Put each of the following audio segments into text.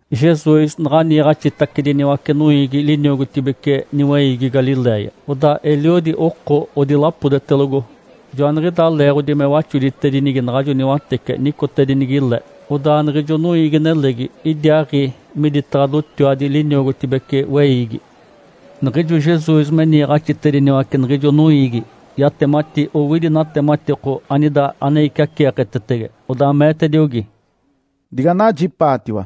Jesus naɡ̶a niiɡ̶axitacediniwace noiigi liniogotibece niweiigi Galiléia. Odaa eliodi oko odilapodetelogo. Joaniɡ̶idaa leeɡ̶odi me waxoditedinigi naɡ̶ajo niwatece nicotedinigi le, odaa niɡ̶ijo noiigi-nelegi idiaaɡ̶i miditaɡ̶a dotiwadi liniogotibece weiigi. Niɡ̶ijo Jesus me niiɡ̶axitediniwace niɡ̶ijo noiigi, yatemati owidi natematiko anida ane iciaceeketetege. Odaa meetediogi, “Diganajipaatiwa!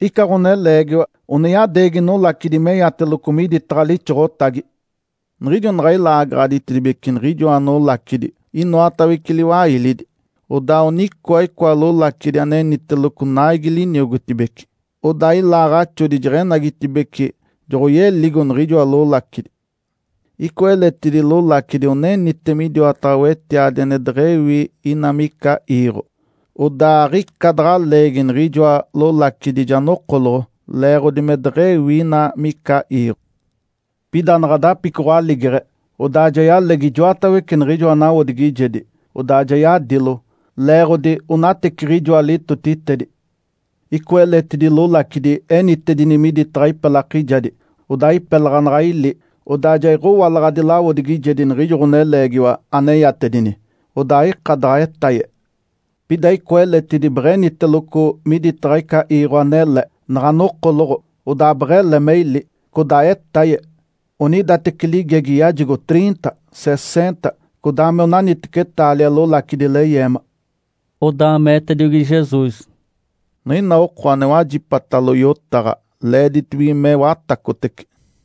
Ica ɡ̶oneleegiwa one yadeegi nolacidi meyateloco miditaɡ̶a lixoɡ̶otagi. Niɡ̶ijo naɡ̶a ilaagaɡ̶aditedibece niɡ̶ijoa nolacidi inoatawece liwailidi, odaa onicoa icoa lolacidi aneniteloco naigi liniogotibece. Odaa ilaaɡ̶axodi jeɡ̶enagitibeci, joɡ̶oyelio niɡ̶ijoa lolacidi. Icoa eletidi lolacidi onenite midiwataɡ̶a wetiadi ane deɡ̶ewi ina mica iiɡ̶o. Odaa aɡ̶ica daɡ̶a leegi niɡ̶ijoa lolacidi ja nokoloɡ̶o leeɡ̶odi me deɡ̶ewi ina mica iiɡ̶o. Pida naɡ̶a dapicoɡ̶o aligeɡ̶e, odaa ja yalegi ijoatawece niɡ̶ijoa nawodigijedi, odaa ja yadilo, leeɡ̶odi onateciɡ̶ijoa litotitedi. Icoa eletidi lolacidi enitedini miditaɡ̶a ipelakijadi. Odaa ipelaɡ̶a naɡ̶a ili, odaa ja iɡ̶owalaɡ̶adi lawodigijedi niɡ̶ijo ɡ̶oneleegiwa aneyatedini, odaa aika daɡ̶a etaye. Pida icoa eletidi beɡ̶eniteloco miditaɡ̶a ica iiɡ̶o anele. Naɡ̶a nokoloɡ̶o, odaa beɡ̶ele me ili, codaa etaye. Onidateci ligegi yajigo triinta, seseenta, codaa me onaniteci taalia lolacidi leyeema.” Odaa meetediogi Jesus, “Niɡ̶ina oko ane wajipatalo yotaɡ̶a, leeditibige me watacotece.”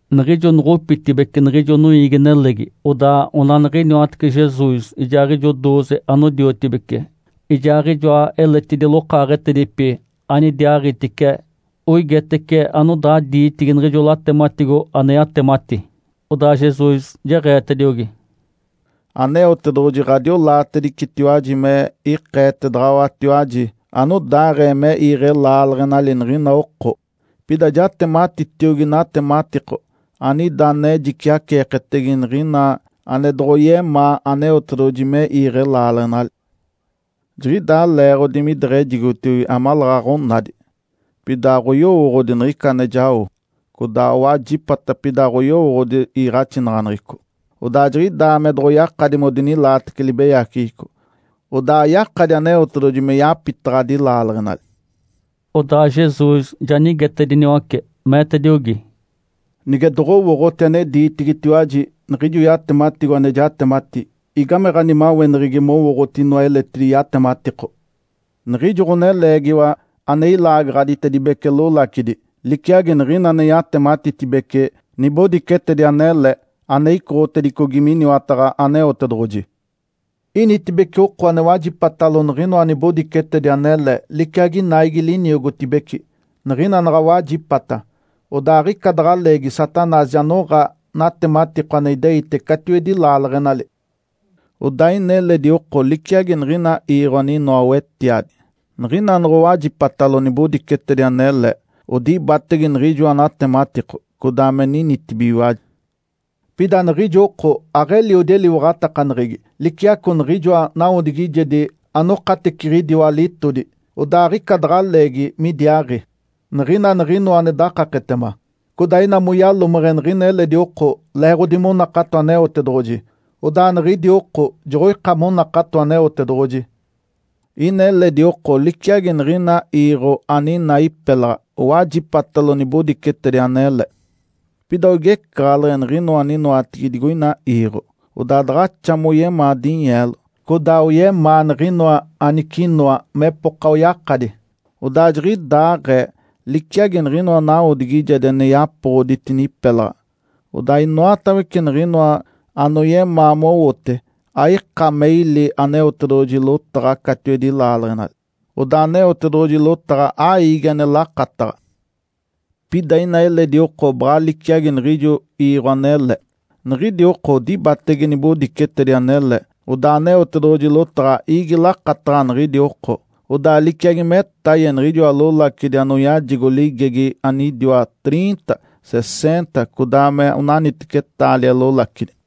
Niɡ̶ijo noɡ̶opitibeci niɡ̶ijo noiigi-nelegi, odaa onaniɡ̶iniwatece Jesus ijaaɡ̶ijo dooze anodiotibece ijaaɡ̶ijoa eletidi lokaaɡ̶etedipi anidiaaɡ̶itice oigetece anodaa diitigi niɡ̶ijo latematigo ane yatemati. Odaa Jesus jeɡ̶eetediogi, “Aneotedoɡ̶oji ɡ̶adiolaatedicetiwaji me ikeetedaɡ̶awatiwaji anodaaɡ̶ee me iiɡ̶e laaleɡ̶enali niɡ̶ina oko. Pida jatematitiogi natematiko anida ane jiciaceeketege niɡ̶ina ane doɡ̶oyemaa Aneotedoɡ̶oji me iiɡ̶e laaleɡ̶enali. ‘Jiɡ̶idaa leeɡ̶odi mideɡ̶ejigotiogi amaleeɡ̶aɡ̶a onadi, pida aɡ̶oyowooɡ̶odi niɡ̶ica ane jao, codaa owajipata, pida aɡ̶oyowooɡ̶odi iiɡ̶axinaɡ̶aneɡ̶eco. Odaa jiɡ̶idaa me doɡ̶oyakadi modinilaatece libeyaceɡ̶eco, odaa ayakadi Aneotedoɡ̶oji me yapitaɡ̶adi laaleɡ̶enali.’” Odaa Jesus ja nigetediniwace, meetediogi, “Nige doɡ̶owooɡ̶oti ane diitigitiwaji niɡ̶ijo yatematigo ane jatemati, igame ɡ̶animaweneɡ̶egi mowooɡ̶oti inoa eletidi yatematiko? Niɡ̶ijo ɡ̶oneleegiwa ane ilaagaɡ̶aditedibece lolacidi liciagi niɡ̶ina ane yatematitedibece nibodicetedi anele ane icoɡ̶otedicogi miniwataɡ̶a Aneotedoɡ̶oji. Initibece oko ane wajipatalo niɡ̶inoa nibodicetedi anele liciagi naigi liniogotibece. Niɡ̶ina naɡ̶a wajipata, odaa aɡ̶ica daɡ̶a leegi Satanás ja noɡ̶a natematiko ane ideite catiwedi laaleɡ̶enali. Odaa ina eledi oko liciagi niɡ̶ina iiɡ̶o aninoa wetiadi. Niɡ̶ina noɡ̶owajipatalo nibodicetedi anele, odibatege niɡ̶ijoa natematiko, codaa me ninitibigiwaji. Pida niɡ̶ijo oko aɡ̶eliodi eliwaɡ̶atakaneɡ̶egi liciaco niɡ̶ijoa nawodigijedi anokateciɡ̶idiwa litodi, odaa aɡ̶ica daɡ̶a leegi midiaaɡ̶i. Niɡ̶ina niɡ̶inoa ane dakaketema, codaa ina moyalomeɡ̶e niɡ̶ina eledi oko leeɡ̶odi monakato Aneotedoɡ̶oji, odaa niɡ̶idi oko joɡ̶oika monakato Aneotedoɡ̶oji. Ina eledi oko liciagi niɡ̶ina iiɡ̶o aninaa ipelaɡ̶a. Owajipatalo nibodicetedi anele. Pida oigecaɡ̶aleɡ̶e niɡ̶inoa aninoatigi digoina iiɡ̶o, odaa daɡ̶axa moyemaa dinyeelo, codaa oyemaa niɡ̶inoa anicinoa mepoka oyakadi. Odaa jiɡ̶idaaɡ̶ee, liciagi niɡ̶inoa nawodigijedi ane yapoɡ̶oditini ipelaɡ̶a, odaa inoatawece niɡ̶inoa anoyemaa mowote aika me ili Aneotedoɡ̶oji lotaɡ̶a catiwedi laaleɡ̶enali, odaa Aneotedoɡ̶oji lotaɡ̶a aiigi ane lakataɡ̶a. Pida ina eledi oko baɡ̶a liciagi niɡ̶ijo iiɡ̶o anele. Niɡ̶idi oko odibatege nibodicetedi anele, odaa Aneotedoɡ̶oji lotaɡ̶a iigi lakataɡ̶a niɡ̶idi oko, odaa liciagi metaye niɡ̶ijoa lolacidi anoyajigo ligegi anidiwa triinta, seseenta codaa me onaniteci taalia lolacidi.”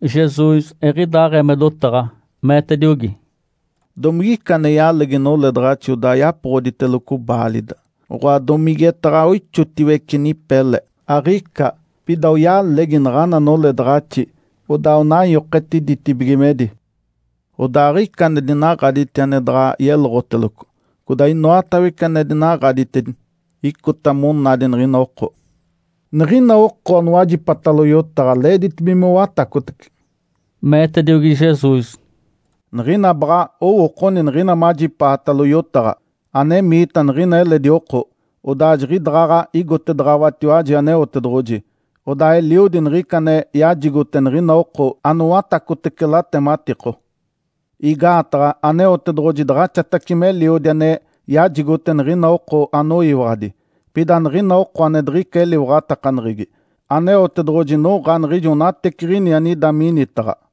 Jesus eɡ̶idaaɡ̶ee me dotaɡ̶a, meetediogi, “Domigica ane yalegi noledaɡ̶axi odaa yapoɡ̶oditeloco baalida, oɡ̶oa domigetaɡ̶a ixotiwece nipe le? Aɡ̶ica! Pida oyalegi naɡ̶ana noledaɡ̶axi, odaa onanyoketi ditibigimedi. Odaa aɡ̶ica ane dinaɡ̶aditi ane daɡ̶a yeloɡ̶oteloco. Codaa inoatawece ane dinaɡ̶aditedini, icota monadi niɡ̶ina oko. Niɡ̶ina oko anowajipatalo yotaɡ̶a leeditibige mowatacotece.” Meetediogi Jesus, “Niɡ̶ina baɡ̶a owookoni niɡ̶ina majipaatalo yotaɡ̶a. Anemiita niɡ̶ina eledi oko, odaa jiɡ̶idaɡ̶aɡ̶a igotedaɡ̶awatiwaji Aneotedoɡ̶oji, odaa eliodi niɡ̶ica ane yajigote niɡ̶ina oko anowatacotece latematiko. Igaataɡ̶a Aneotedoɡ̶oji daɡ̶axatace meliodi ane yajigote niɡ̶ina oko anoyiwaɡ̶adi. Pida niɡ̶ina oko ane diɡ̶ica eliwaɡ̶atakaneɡ̶egi, Aneotedoɡ̶oji noɡ̶a niɡ̶ijo onateciɡ̶ini anida minitaɡ̶a.”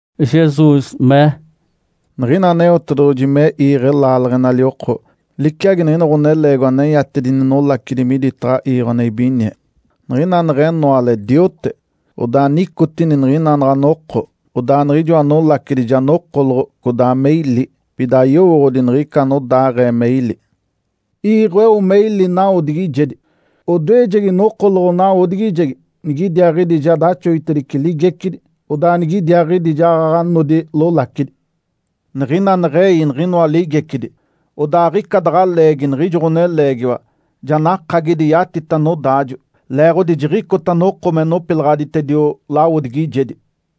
Jesus mee, “Niɡ̶ina Aneotedoɡ̶oji me iiɡ̶e laaleɡ̶enali oko, liciagi niɡ̶ina ɡ̶oneleegiwa aneyatedini nolacidi miditaɡ̶a iiɡ̶o ane ibinie. Niɡ̶ina neɡ̶enoale diote, odaa nicotini niɡ̶ina naɡ̶a noko, odaa niɡ̶ijoa nolacidi ja nokoloɡ̶o codaa me ili, pida ayowooɡ̶odi niɡ̶ica anodaaɡ̶ee me ili. Iiɡ̶o eo me ili nawodigijedi. Odoejegi nokoloɡ̶o nawodigijegi, nigidiaaɡ̶idi ja daxoditice ligecidi. Odaa nigidiaaɡ̶idi jaɡ̶aɡ̶a nodi lolacidi. Niɡ̶ina neɡ̶ei niɡ̶inoa ligecidi, odaa aɡ̶ica daɡ̶a leegi niɡ̶ijo ɡ̶oneleegiwa ja nakagidi yatita nodaajo, leeɡ̶odi jiɡ̶icota noko me nopilaɡ̶aditedio lawodigijedi.”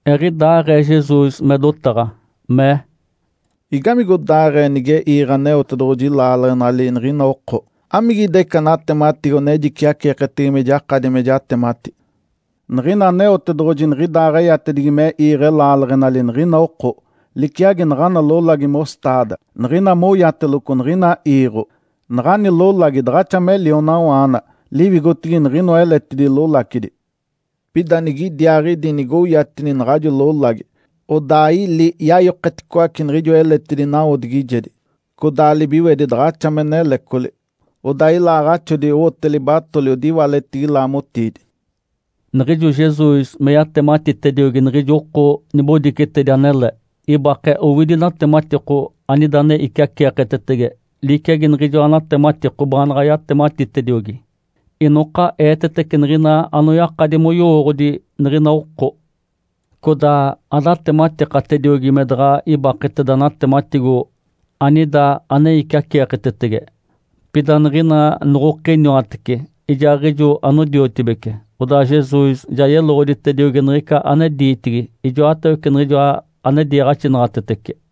Eɡ̶idaaɡ̶ee Jesus me dotaɡ̶a, mee, “Igamigodaaɡ̶ee nige iiɡ̶e Aneotedoɡ̶oji laaleɡ̶enali niɡ̶ina oko? Amigida ica natematigo ane jiciaceeketege me jakadi me jatemati? Niɡ̶ina Aneotedoɡ̶oji niɡ̶idaaɡ̶eyatedigi me iiɡ̶e laaleɡ̶enali niɡ̶ina oko, liciagi naɡ̶ana lolagi mostaada. Niɡ̶ina moyateloco niɡ̶ina iiɡ̶o, naɡ̶ani lolagi daɡ̶axa me lionawaana liwigotigi niɡ̶inoa eletidi lolacidi. Pida nigidiaaɡ̶idi nigoyatini naɡ̶ajo lolagi, odaa ili yayoketicoace niɡ̶ijoa eletidi nawodigijedi. Codaa libiwedi daɡ̶axa me nelecoli, odaa ilaaɡ̶axodi owote libatoli odiwaletigi laamotiidi.” Niɡ̶ijo Jesus me yatematitediogi niɡ̶ijo oko nibodicetedi anele, ibake owidi natematiko anida ane iciaceeketetege liciagi niɡ̶ijoa natematiko baanaɡ̶a yatematitediogi. Inoka eetetece niɡ̶ina anoyakadi moyowooɡ̶odi niɡ̶ina oko. Codaa adatematikatediogi me daɡ̶a ibaketeda natematigo anida ane iciaceeketege. Pida niɡ̶ina noɡ̶okiniwatece ijaaɡ̶ijo anodiotibece, odaa Jesus ja yeloɡ̶oditediogi niɡ̶ica ane diitigi ijoatawece niɡ̶ijoa ane diiɡ̶axinaɡ̶atetece.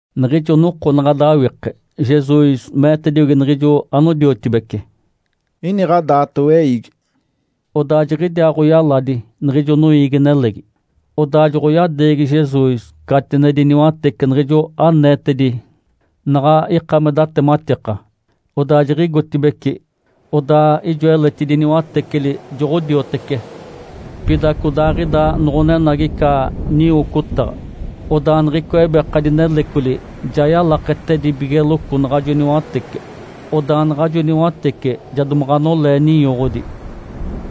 Niɡ̶ijo noko naɡ̶a dawike, Jesus meetediogi niɡ̶ijo anodiotibece, “Iniɡ̶a daato weiigi.” Odaa jiɡ̶idiaaɡ̶oyaladi niɡ̶ijo noiigi-nelegi, odaa joɡ̶oyadeegi Jesus catinedi niwatece niɡ̶ijo aneetedi naɡ̶a ika me datematika, odaa jiɡ̶igotibeci. Odaa ijoa eletidi niwateceli joɡ̶odiotece. Pida codaaɡ̶ida noɡ̶onenagi ica niwocotaɡ̶a. Odaa niɡ̶icoa ebekadi nelecoli ja yalaketedibigeloco naɡ̶ajo niwatece, odaa naɡ̶ajo niwatece ja domaɡ̶a nolee ninyoɡ̶odi.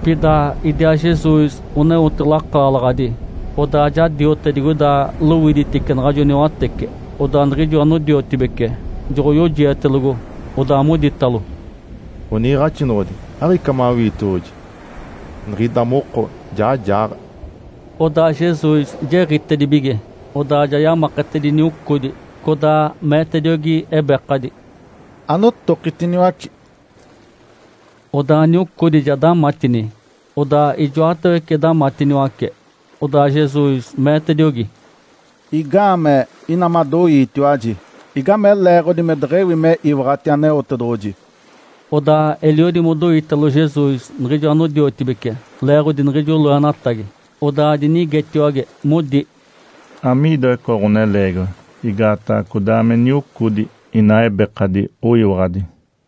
Pida idiaa Jesus oneote lakaalaɡ̶adi, odaa ja diote digoida lowiditice naɡ̶ajo niwatece. Odaa niɡ̶ijo anodiotibece joɡ̶oyojietelogo, odaa moditalo, “Ǥoniiɡ̶axinoɡ̶odi, aɡ̶ica mawiitioɡ̶oji? Niɡ̶ida moko ja jaaɡ̶a!” Odaa Jesus jiɡ̶itedibige, odaa ja yamaketedini niocodi, codaa meetediogi ebekadi, “Anotokitiniwaci!” Odaa niocodi ja damatini, odaa ijoatawece damatiniwace. Odaa Jesus meetediogi, “Igaamee ina madoiitiwaji? Igame leeɡ̶odi me deɡ̶ewi me iwaɡ̶ati Aneotedoɡ̶oji?” Odaa eliodi modoitalo Jesus niɡ̶ijo anodiotibece leeɡ̶odi niɡ̶ijo loenatagi. Odaa dinigetiwage, modi, “Amiidoa icoa ɡ̶oneleegiwa? Igaataɡ̶a codaa me niocodi inaa ebekadi oyiwaɡ̶adi!”